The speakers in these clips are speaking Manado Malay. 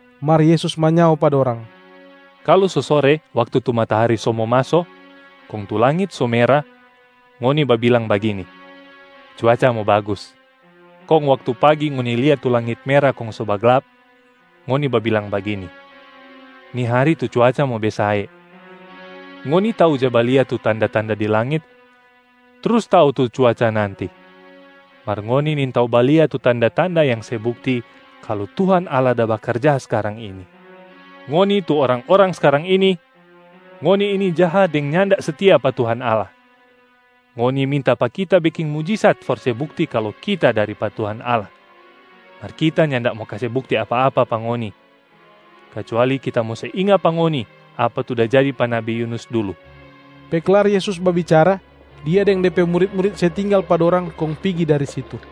Mar Yesus manyao pa dorang, “Kalu so sore waktu tu matahari so mo maso, kong tu langit so mera, ngoni babilang bagini, ‘Cuaca mo bagus.’ Kong waktu pagi ngoni lia tu langit mera kong so baglap, ngoni babilang bagini, ‘Ni hari tu cuaca mo besae.’ Ngoni tau ja balia tu tanda-tanda di langit trus tau tu cuaca nanti, mar ngoni nintau balia tu tanda-tanda yang se bukti kalu Tuhan Allah da bakarja skarang ini. Ngoni tu orang-orang skarang ini, ngoni ini jaha deng nyanda setia pa Tuhan Allah. Ngoni minta pa Kita beking mujisat for se bukti kalu Kita dari pa Tuhan Allah. Mar Kita nyanda mo kase bukti apa-apa pa ngoni, kacuali Kita mo se inga pa ngoni apa tu da jadi pa nabi Yunus dulu.” Pe klar Yesus babicara, Dia deng De pe murit-murit se tinggal pa dorang kong pigi dari situ.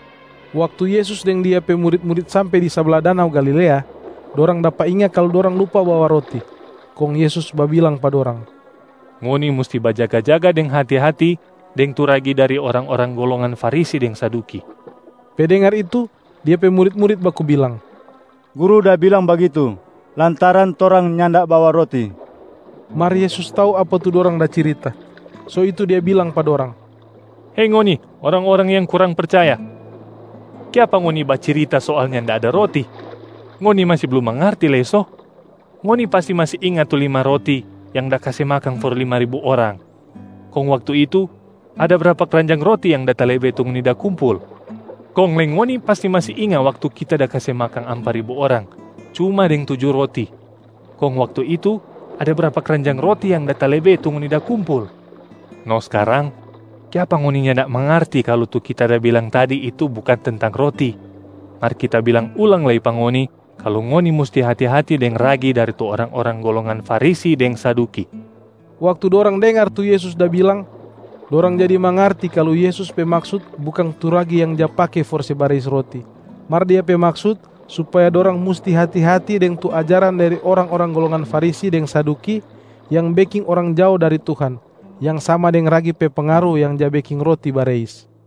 Waktu Yesus deng Dia pe murit-murit sampe di sabla danau Galilea, dorang dapa inga kalu dorang lupa bawa roti. Kong Yesus babilang pa dorang, “Ngoni musti bajaga-jaga deng hati-hati deng tu ragi dari orang-orang golongan Farisi deng Saduki.” Pe dengar itu, Dia pe murit-murit baku bilang, “Guru da bilang bagitu, lantaran torang nyanda bawa roti.” Mar Yesus tau apa tu dorang da cirita, so itu Dia bilang pa dorang, “Hei ngoni orang-orang yang kurang percaya! Kiapa ngoni bacirita soal nyanda ada roti? Ngoni masi blum mangarti lei so? Ngoni pasti masi inga tu lima roti yang da kase makang for lima ribu orang. Kong waktu itu, ada brapa kranjang roti yang da talebe tu ngoni da kumpul? Kong lei ngoni pasti masi inga waktu Kita da kase makang ampa ribu orang cuma deng tuju roti, kong waktu itu ada brapa kranjang roti yang da talebe tu ngoni da kumpul? No skarang, kiapa ngoni nyanda mangarti kalu tu Kita da bilang tadi itu bukang tentang roti? Mar Kita bilang ulang lei pa ngoni kalu ngoni musti hati-hati deng ragi dari tu orang-orang golongan Farisi deng Saduki!” Waktu dorang dengar tu Yesus da bilang, dorang jadi mangarti kalu Yesus pe maksut bukang tu ragi yang ja pake for se bareis roti, mar Dia pe maksut supaya dorang musti hati-hati deng tu ajaran dari orang-orang golongan Farisi deng Saduki, yang beking orang jao dari Tuhan, yang sama deng ragi pe pengaru yang ja beking roti bareis.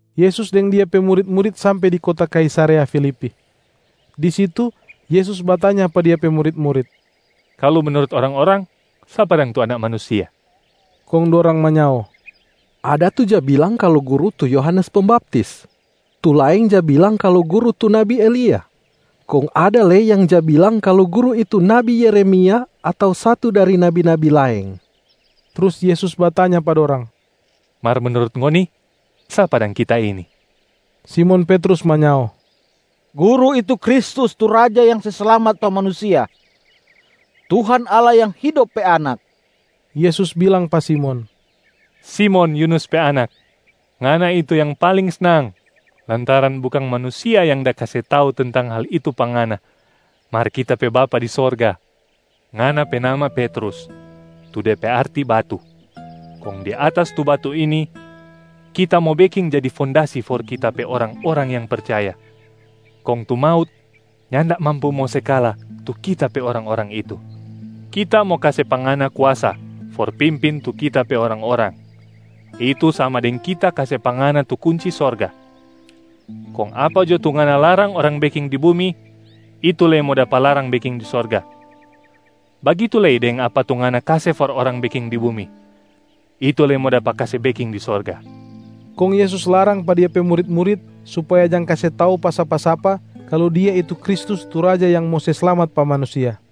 Yesus deng Dia pe murit-murit sampe di kota Kaisarea Filipi. Di situ Yesus batanya pa Dia pe murit-murit, “Kalu menurut orang-orang, sapa dang tu Anak Manusia?” Kong dorang manyao, “Ada tu ja bilang kalu Guru tu Yohanes Pembaptis, tu laeng ja bilang kalu Guru tu nabi Elia, kong ada lei yang ja bilang kalu Guru itu nabi Yeremia ato satu dari nabi-nabi laeng.” Trus Yesus batanya pa dorang, “Mar menurut ngoni, sapa dang Kita ini?” Simon Petrus manyao, “Guru itu Kristus tu Raja yang se slamat pa manusia, Tuhan Allah yang hidop pe Anak!” Yesus bilang pa Simon, “Simon, Yunusa pe anak. Ngana itu yang paling snang lantaran bukang manusia yang da kase tau tentang hal itu pa ngana, mar Kita pe Bapa di sorga. Ngana pe nama Petrus, tu de pe arti batu. Kong di atas tu batu ini, Kita mo beking jadi fondasi for Kita pe orang-orang yang percaya, kong tu maut nyanda mampu mo se kala tu Kita pe orang-orang itu. Kita mo kase pa ngana kuasa for pimpin tu Kita pe orang-orang, itu sama deng Kita kase pa ngana tu kunci sorga. Kong apa jo tu ngana larang orang beking di bumi, itu lei mo dapa larang beking di sorga. Bagitu lei deng apa tu ngana kase for orang beking di bumi, itu lei mo dapa kase beking di sorga.” Kong Yesus larang pa Dia pe murit-murit supaya jang kase tau pa sapa-sapa kalu Dia itu Kristus tu Raja yang mo se slamat pa manusia.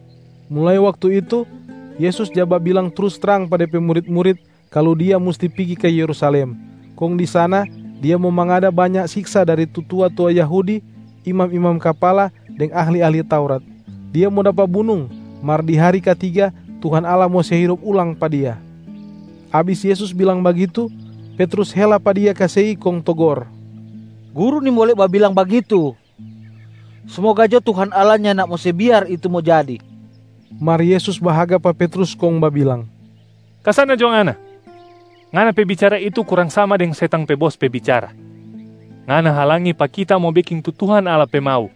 Mulai waktu itu, Yesus ja babilang trus trang pa De pe murit-murit kalu Dia musti pigi ka Yerusalem, kong di sana Dia mo mangada banya siksa dari tu tua-tua Yahudi, imam-imam kapala deng ahli-ahli Taurat. Dia mo dapa bunung, mar di hari katiga Tuhan Allah mo se hidop ulang pa Dia. Abis Yesus bilang bagitu, Petrus hela pa Dia ka sei kong togor, “Guru nimbole babilang bagitu! Smoga jo Tuhan Allah nyanda mo se biar itu mo jadi.” Mar Yesus bahaga pa Petrus kong babilang, “Ka sana jo ngana! Ngana pe bicara itu kurang sama deng setang pe bos pe bicara. Ngana halangi pa Kita mo beking tu Tuhan Allah pe mau,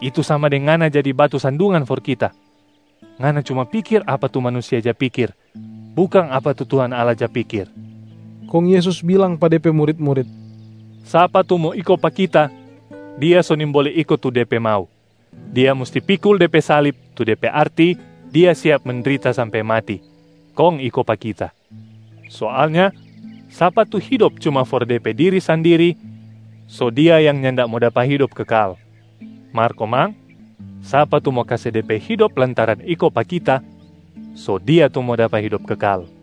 itu sama deng ngana jadi batu sandungan for Kita. Ngana cuma pikir apa tu manusia ja pikir, bukang apa tu Tuhan Allah ja pikir.” Kong Yesus bilang pa De pe murit-murit, “Sapa tu mo iko pa Kita, dia so nimbole iko tu de pe mau, dia musti pikul de pe salib tu de pe arti dia siap mendrita sampe mati, kong iko pa Kita. Soalnya sapa tu hidop cuma for de pe diri sandiri, so dia yang nyanda mo dapa hidop kekal. Mar komang, sapa tu mo kase de pe hidop lantaran iko pa Kita, so dia tu mo dapa hidop kekal.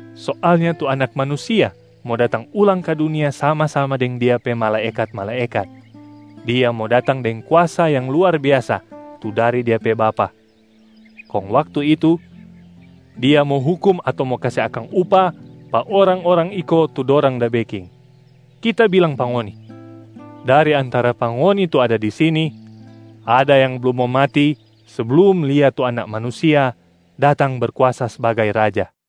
Soalnya tu Anak Manusia mo datang ulang ka dunia sama-sama deng Dia pe malaekat-malaekat, Dia mo datang deng kuasa yang luar biasa tu dari Dia pe Bapa. Kong waktu itu, Dia mo hukum ato mo kase akang upah pa orang-orang iko tu dorang da beking. Kita bilang pa ngoni, dari antara pa ngoni tu ada di sini, ada yang blum mo mati seblum lia tu Anak Manusia datang Berkuasa sbagai Raja.”